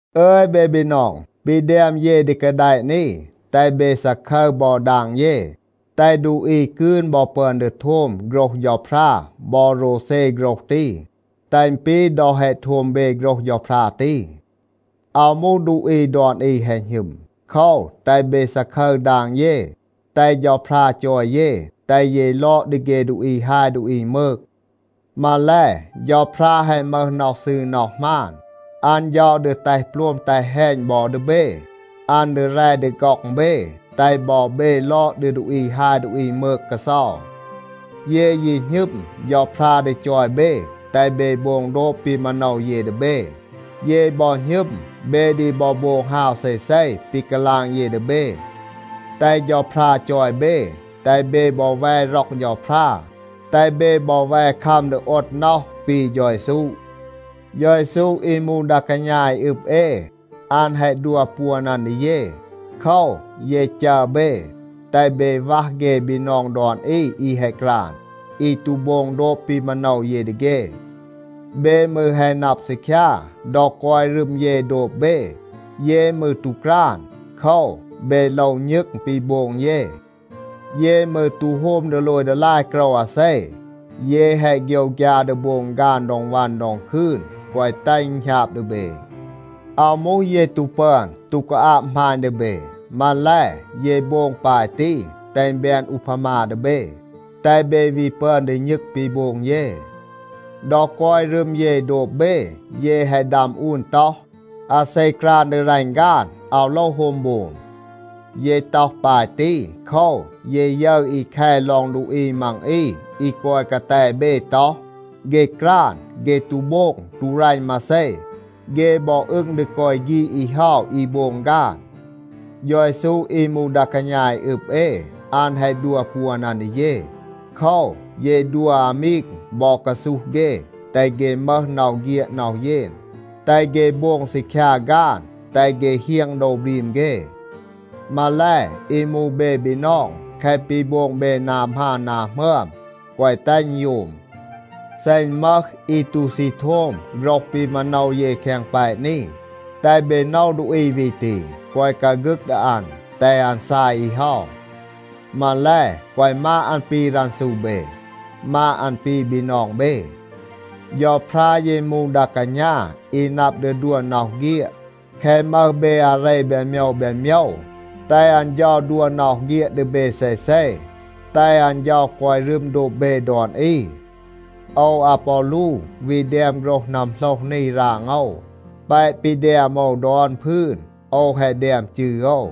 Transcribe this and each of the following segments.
อึย เบ บีนอง, ปี แดม เย ดี กาแดะ นี, แตห เบ ซาคึร บอ ดาง เย, แตห ดูอี กืน บอ ปึอน ดี โทม โฆรห เฌาพรา บอ โรวเซ โฆรห ตี, แตห อึณ ปี ดอ แฮะ โทม เบ โฆรห เฌาพรา ตี. อาว มูห ดูอี ดอน อี แฮะ หณึม. โคว, แตห เบ ซาคึร ดาง เย, แตห เฌาพรา จอย เย, แตห เย ลอด ดี เฆ ดูอี ฮาย ดูอี มืก. มาแล, เฌาพรา แฮะ มึห น็อห ซืร น็อห หมาน. อัน เฌา ดี แตห โปลม, แตห แฮณ บอ ดี เบ. อัน ดี แร ดี ฆ็อง เบ, แตห บอ เบ ลอด ดี ดูอี อี ฮาย อี มืก กาเซา. เย ยี หณึม, เฌาพรา ดี จอย เบ, แตห เบ โบง โดบ ปี มาโนว เย ดี เบ. เย บอ หณึม, เบ ดี บอ โบง ฮาว เซเซ ปี กาลาง เย ดี เบ. แตห เฌาพรา จอย เบ, แตห เบ บอ แว ร็อก เฌาพรา, แตห เบ บอ แว คัม ดี โอด น็อห ปี เฌา เยซู. เฌา เยซู อี มูห ดา กาณา อี อึบ เอ, อัน แฮะ ดัว ปวน อัน ดี เย. โคว, เย จัร เบ, แตห เบ วัห เฆ บีนอง ดอน อี อี แฮะ กราน, อี ตู โบง โดบ ปี มาโนว เย ดี เฆ. เบ มืร แฮะ นับ ซีคยา, ดอ กอย รึม เย โดบ เบ, เย มืร ตู กราน. โคว, เบ โลว ณึง ปี โบง เย. เย มืร ตู โฮม ดีโลย ดีลาย โกรว อาเซ. เย แฮะ โฆยวฆยา ดี โบง ฆาน ดอง วัน ดอง คืน, แกวะ แตห อึณ หณาบ ดี เบ. อาว มูห เย ตู ปึอน, ตู กาอาบ หมาณ ดี เบ. มาแล, เย โบง ปาย ตี, แตห อึณ แบน อูพามา ดี เบ, แตห เบ วี ปึอน ดี ณึง ปี โบง เย. ดอ กอย รึม เย โดบ เบ, เย แฮะ ดัม อูน ต็อห, “อาเซ กราน ดี รัณ ฆาน, อาว โลว โฮม โบม.” เย ต็อห ปาย ตี โคว, เย ยึร อี แค ลอง ดูอี มัง อี อี กอย กาแต เบ ต็อห, เฆ กราน. เฆ ตู โบง, ตู รัณ มาเซ. เฆ บอ อึง ดี กอย ฆีด อี เฮา อี โบง ฆาน. เฌา เยซู อี มูห ดา กาณา อี อึบ เอ, อัน แฮะ ดัว ปวน อัน ดี เย. โคว, เย ดัว อามีง บอ กาซูห เฆ, แตห เฆ มึห น็อห เฆียด น็อห เยน, แตห เฆ โบง ซีคยา ฆาน, แตห เฆ เฮียง โดว บรีม เฆ. มาแล, อี มูห เบ บีนอง, แคะ ปี โบง เบ นา หมาน นา หมึอม, แกวะ แตห อึณ โยม. เซ อึณ มึห อี ตู ซี โทม โฆรห ปี มาโนว เย แคง แปะ นี, แตห เบ โนว ดูอี วี ตี. แกวะ กาฆึก ดี อัน, แตห อัน ซาย อี เฮา. มาแล, แกวะ มาด อัน ปี รันซู เบ. มาด อัน ปี บีนอง เบ. เฌาพรา ยี มูห ดา กาณา อี นับ ดี ดัว น็อห เฆียด. แคะ มึห เบ อาเร แบน โมยว แบน โมยว, แตห อัน เฌา ดัว น็อห เฆียด ดี เบ เซเซ. แตห อัน เฌา กอย รึม โดบ เบ ดอน อี. โอว อาปอลู วี แดม โฆรห นัมโหลห นี ราง โอว. แปะ ปี แดม โอว ดอน พืน, โอว แฮะ แดม จืร โอว.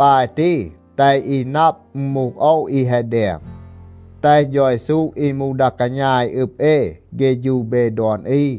ปาย ตี แตห อี นับ, อึณ มูห โอว อี แฮะ แดม. แตห เฌา เยซู อี มูห ดา กาณา อี อึบ เอ เฆฌู เบ ดอน อี.